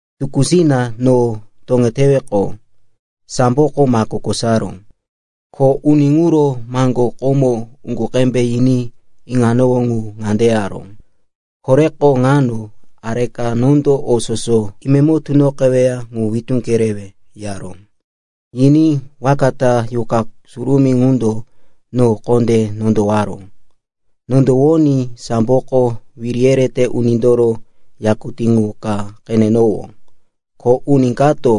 Tukúsina no toŋeteweqo, samboko mako kosaró. Ko uni ŋuro maŋgó komo uŋgu qembe yiní iŋanowó ŋu ŋande yaró, “Koreko ŋano areka nondo o soso imemo tunoqeweya ŋu witú kerewe,” yaró. Yiní waka ta Yuqa Surumí ŋundo no kondé nondowaró. Nondowoní samboko wiri yerete unindoro yakutí qu ka qenenowó, ko uni kato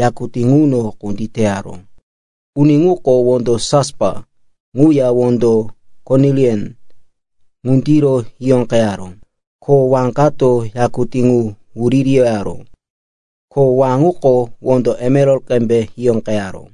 yakutí ŋuno kunditaró. Uni ŋuko wondo jaspa ŋuya wondo konilian ŋundiro hiyóqeyaró. Ko wá kato yakutí ŋu wuririyaró, ko wá ŋuko wondo emeral qembe hiyóqeyaró.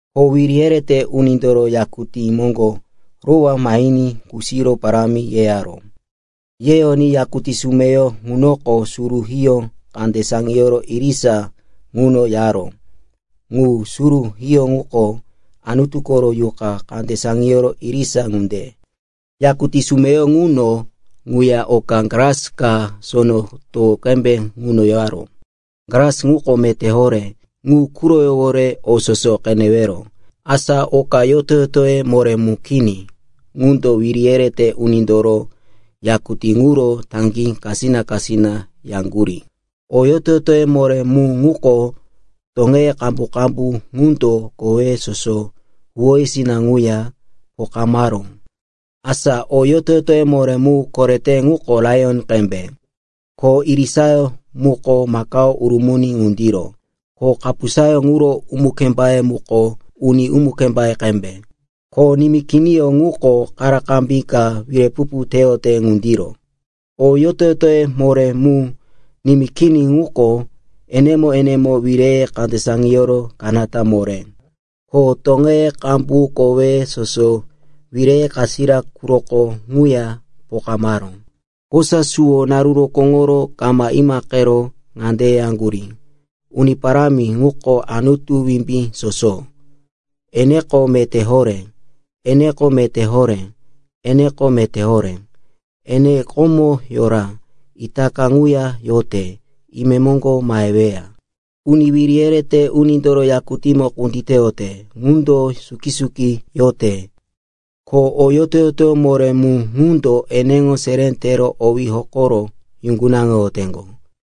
Ko wiri yerete unindoro yakutí moŋgo rowá mahiní kusiro parámi yeyaró. Yeyoní yakutí sumeyo ŋunoko suru hiyó kande saŋiyoro irisa ŋuno yaró. Ŋu suru hiyó ŋuko Anutu koro yuqa kande saŋiyoro irisa ŋunde. Yakutí sumeyo ŋuno ŋuya oka glas ka sono towo qembe ŋuno yaró. Glas ŋuko meté horé, ŋu quroyówore o soso qenewero. Asa oka yoto-yotoye moré mu nimí kini qundo wiri yerete unindoro yakutí ŋuro taŋgí kasina-kasina yaŋgurí. O yoto-yotoye moré mu ŋuko toŋeye qambu-qambu ŋundo koweye soso, huwóyesina ŋuya pokamaró. Asa o yoto-yotoyó moré mu korete ŋuko laiyon qembe. Ko irisayó muko makao urumuni ŋundiro. Ko kapusayó ŋuro umu-kembé muko uni umu-kembé qembe. Ko nimí kiniyó ŋuko karakarambí ka wirepupu teyote ŋundiro. O yoto-yotoye moré mu nimí kini ŋuko enemo-enemo wireye kande saŋiyoro kanata moré. Ko toŋeye qambu koweye soso, wireye kasira quroko ŋuya pokamaró. Kosa suwo naru rokóŋoro kama imaqero ŋande yeyaŋgurí, “Uni Parámi ŋuko Anutu Wimbí Soso, eneko meté horé, eneko meté horé, eneko meté horé. Ene komo yora, itaka ŋuya yote, imemoŋgo maheweya.” Uni wiri yerete unindoro yakutímo kunditeyote ŋundo suki-suki yote, ko o yoto-yotoye moré mu ŋundo eneŋo seré tero owí hokoro yuŋgunaŋoyoteŋgo.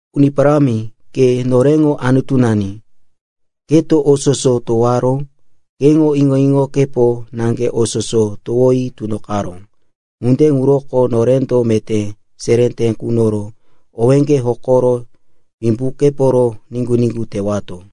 “Uni Parámi, ke noreŋo Anutunani. Keto o soso towaró, keŋo iŋo-iŋokepo naŋge o soso towi tunoqaró. Ŋunde ŋuroko norendo meté seré te kunoro owéŋge hokoro wimbukeporo niŋgu-niŋgu tewato.”